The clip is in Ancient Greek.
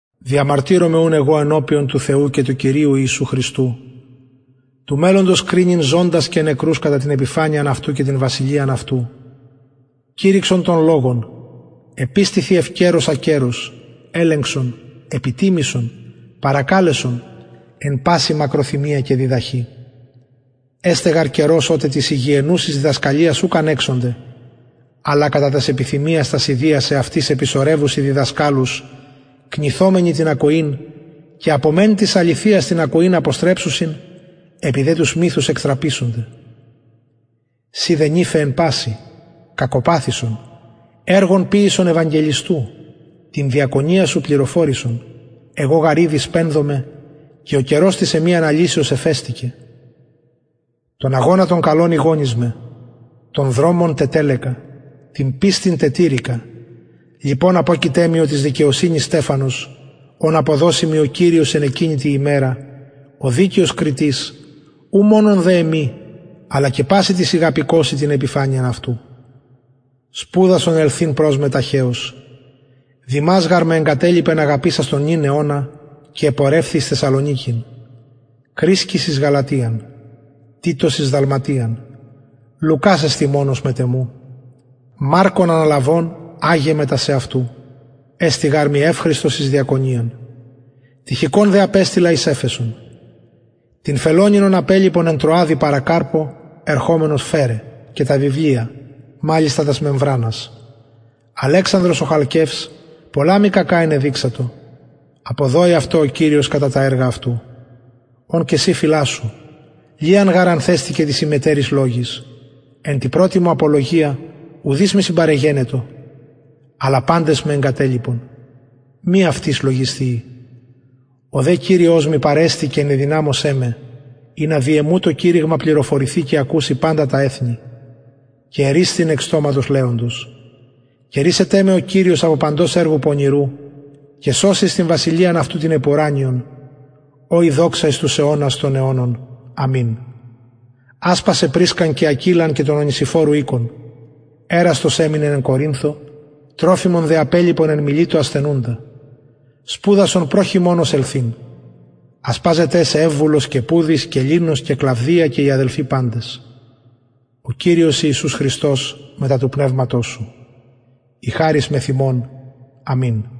διαμαρτυρομαι ουν εγω ενωπιον του θεου και του κυριου ιησου χριστου του μελλοντος κρινειν ζωντας και νεκρους κατα την επιφανειαν αυτου και την βασιλειαν αυτου κηρυξον τον λογον επιστηθι ευκαιρως ακαιρως ελεγξον επιτιμησον παρακαλεσον εν παση μακροθυμια και διδαχη εσται γαρ καιρος οτε της υγιαινουσης διδασκαλιας ουκ ανεξονται αλλα κατα τας επιθυμιας τας ιδιας εαυτοις επισωρευσουσιν διδασκαλους κνηθομενοι την ακοην και απο μεν της αληθειας την ακοην αποστρεψουσιν επι δε τους μυθους εκτραπησονται συ δε νηφε εν πασιν κακοπαθησον εργον ποιησον ευαγγελιστου την διακονιαν σου πληροφορησον εγω γαρ ηδη σπενδομαι και ο καιρος της εμης αναλυσεως εφεστηκεν τον αγωνα τον καλον ηγωνισμαι τον δρομον τετελεκα την πιστιν τετηρηκα λοιπον αποκειται μοι ο της δικαιοσυνης στεφανος ον αποδωσει μοι ο κυριος εν εκεινη τη ημερα ο δικαιος κριτης ου μονον δε εμοι αλλα και πασιν τοις ηγαπηκοσιν την επιφανειαν αυτου σπουδασον ελθειν προς με ταχεως δημας γαρ με εγκατελιπεν αγαπησας τον νυν αιωνα και επορευθη εις θεσσαλονικην κρησκης εις γαλατιαν τιτος εις δαλματιαν λουκας εστιν μονος μετ εμου μαρκον αναλαβων αγε μετα σεαυτου εστιν γαρ μοι ευχρηστος εις διακονιαν τυχικον δε απεστειλα εις εφεσον τον φελονην ον απελιπον εν τρωαδι παρα καρπω ερχομενος φερε και τα βιβλια μαλιστα τας μεμβρανας αλεξανδρος ο χαλκευς πολλα μοι κακα ενεδειξατο αποδωη αυτω ο κυριος κατα τα εργα αυτου ον και συ φυλασσου λιαν γαρ ανθεστηκεν τοις ημετεροις λογοις εν τη πρωτη μου απολογια ουδεις μοι συμπαρεγενετο αλλα παντες με εγκατελιπον μη αυτοις λογισθειη ο δε κυριος μοι παρεστη και ενεδυναμωσεν με ινα δι εμου το κηρυγμα πληροφορηθη και ακουση παντα τα εθνη και ερρυσθην εκ στοματος λεοντος και ρυσεται με ο κυριος απο παντος εργου πονηρου και σωσει εις την βασιλειαν αυτου την επουρανιον ω η δοξα εις τους αιωνας των αιωνων αμην ασπασαι πρισκαν και ακυλαν και τον ονησιφορου οικον εραστος εμεινεν εν κορινθω τροφιμον δε απελιπον εν μιλητω ασθενουντα σπουδασον προ χειμωνος ελθειν ασπαζεται σε ευβουλος και πουδης και λινος και κλαυδια και οι αδελφοι παντες ο κυριος ιησους χριστος μετα του πνευματος σου η χαρις μεθ υμων αμην